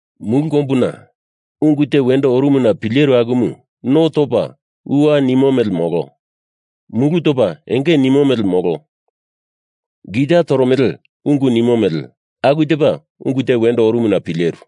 Mulu kombuna ungu te wendo orumuna pileru akumu no topa uwa enge nimo mele, molo mulu topa enge nimo mele, molo gitama toromele ungu nimo mele, aku tepa ungu te wendo orumuna pileru.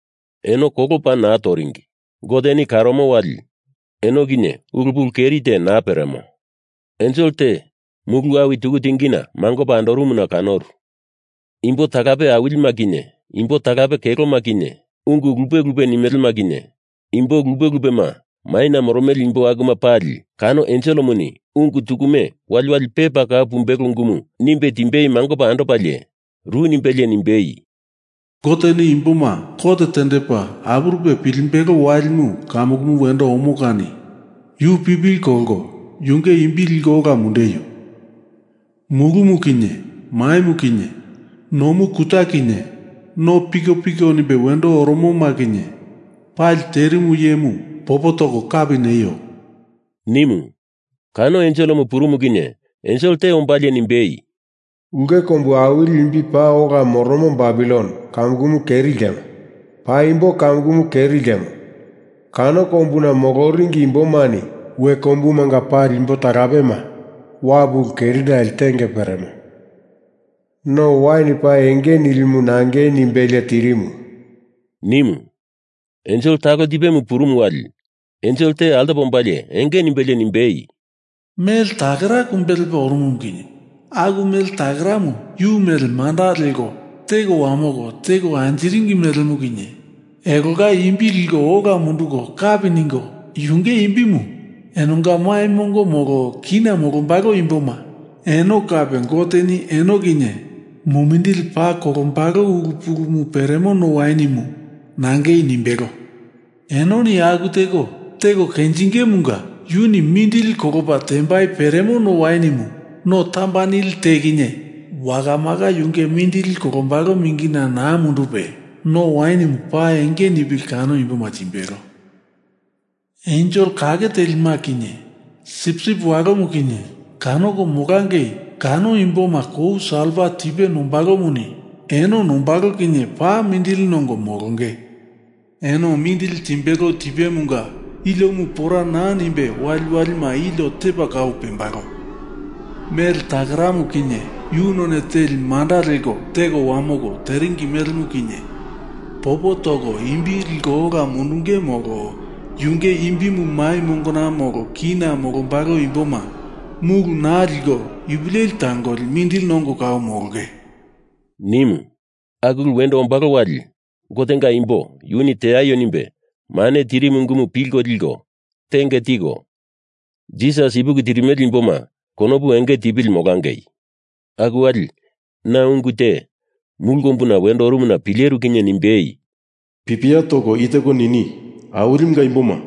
Eno kolo paa naa toringi. Goteni karomo wali eno kinye ulu pulu keri te naa peremo. Ensel te mulu awi tuku tingina mangopa andorumuna kanoru. Imbo talape awilima kinye imbo talape keloma kinye, ungu lupe lupe nimelema kinye, imbo lupe lupema maina moromele imbo akuma pali kano enselemuni ungu tukume waliwalima pepa kau pumbelo ungu nimbe timbei mangopa andopalie, ru nimbelie nimbei, “Goteni imboma kot tendepa apurupe pilimbelo walimu kamukumu wendo omo kani yu pipili kolko yunge imbi liko ola mundeio! Mulumu kinye maimu kinye nomu kuta kinye no pikopiko nimbe wendo oromoma kinye pali terimu iyemu popo toko kapi neio!” nimu. Kano enselemu purumu kinye ensel te ombalie nimbei, “Ulke kombu awili imbi paa ola moromo Babilon kamukumu keri ltemo. Paimbo kamukumu keri ltemo. Kano kombuna moloringi imbomani we kombumanga pali imbo talapema Wapu ulu kerinale tenge peremo, no wain paa enge nilimu nangei nimbelie tirimu,” nimu. Ensel talo tipemu purumu wali ensel te altopa ombalie enge nimbelie nimbei, “Mele takera kumbe lepa oromumu kinye aku mele takeramu yu mele manda leko teko wamoko teko anjiringi melemu kinye elonga imbi liko ola munduko kapi ningo, yunge imbimu enonga mai mongo molo kina molombalo imboma eno kape Goteni eno kinye mumindili paa kolombalo ulu pulumu peremo no wainimu nangei nimbelo. Enoni aku teko, teko kenjingemunga yuni mumindili kolopa tembai peremo no wainimu no tamba nili te kinye wakamaka yunge mindili kolombalo mingina naa mundupe, no wainimu paa enge nipili kano imboma timbelo. Ensel kake telima kinye Sipsip Walomu kinye kanoko molangei kano imboma kou salfa tipe nombalomuni eno nombalo kinye paa mindili nongo molonge. Eno mindili timbelo tipemunga iliomu pora naa nimbe waliwalima ilio tepa kau pembalo. Mele takeramu kinye yu none teli manda leko teko wamoko teringi melemu kinye popo toko imbi liko ola mundunge, molo yunge imbimu mai mongona molo kina molombalo imboma mulu naa liko ipu leli tangoli mindili nongo kau molonge,” nimu. Aku ulumu wendo ombalo wali Gotenga imbo yuni teaio nimbe mane tirimu ungumu pilko liko tenge tiko, Jisas ipuki tirimele imboma konopu enge tipili molangei! Aku wali na ungu te mulu kombuna wendo orumuna pileru kinye nimbei, “Pipia toko i teko nini: Awilimunga imboma,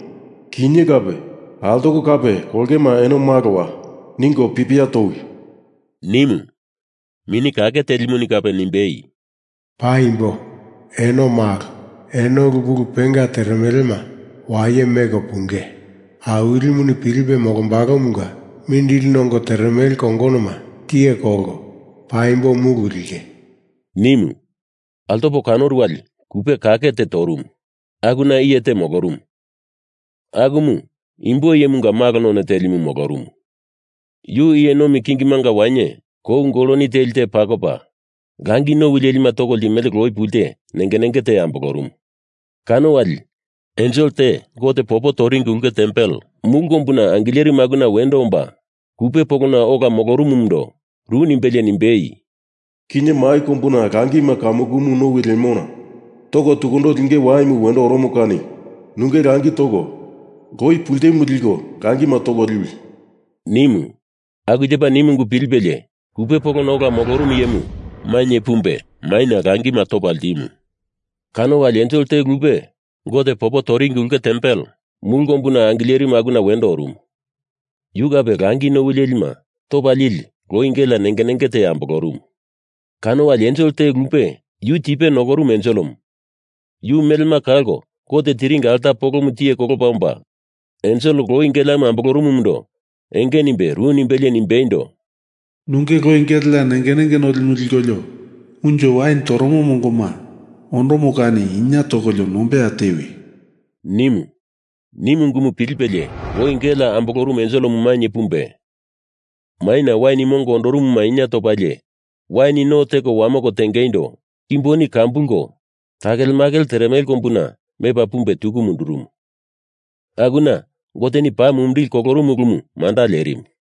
kinye kape altoko kape kolongema eno malowa, ningo pipia towi!” nimu. Mini Kake Telimuni kape nimbei, “Paimbo, eno malo. Eno ulu pulu penga teremelema waye meko punge Awilimuni pilipe molombalomunga mindili nongo teremele kongonoma tiye kolko paimbo mulu linge,” nimu. Altopo kanoru wali kupe kake te torumu. Akuna iye te molorumu, akumu imbo iyemunga malo none telimu molorumu. Yu iye nomi kingimunga wainye kou goloni teli te pakopa, langi nowi lelima toko ltimele loi pulte nenge nenge te ambolorumu. Kano wali ensel te Gote popo toringi ulke tempel mulu kombuna angilerimu akuna wendo omba kupe polona ola molorumumundo ru nimbelie nimbei, “Kinye mai kombuna langima kamukumu nowi lemona toko tukundo linge waimu wendo oromo kani nunge langi toko loi pultemu liko langima toko liwi!” nimu. Aku tepa nimu ungu pilipelie kupe polona ola molorumu iyemu mainye pumbe maina langima topa ltimu. Kano wali ensel te lupe Gote popo toringi ulke tempel mulu kombuna angilerimu akuna wendo orumu. Yu kape langi nowi lelima topa lili loi gelea nenge nenge te ambolorumu. Kano wali ensel te lupe, yu tipe nokorumu enselemu, yu melema kalko Gote tiringi alta polomu tiye kolopa omba, ensel loi geleamu ambolorumumundo enge nimbe ru nimbelie nimbeindo, “Nunge loi gelea nenge nenge nolimu likolio unjo wain toromo mongoma ondomo kani inie tokolio nombeya tewi!” nimu. Nimu ungumu pilipelie loi gelea ambolorumu enselemu mainye pumbe maina wain mongo ondorumuma inie topalie, wain no teko wamoko tengeindo kimboni kambulko takelemakele teremele kombuna mepa pumbe tuku mundurumu. Akuna Goteni paa mumindili kolorumu ulumu manda lerimu.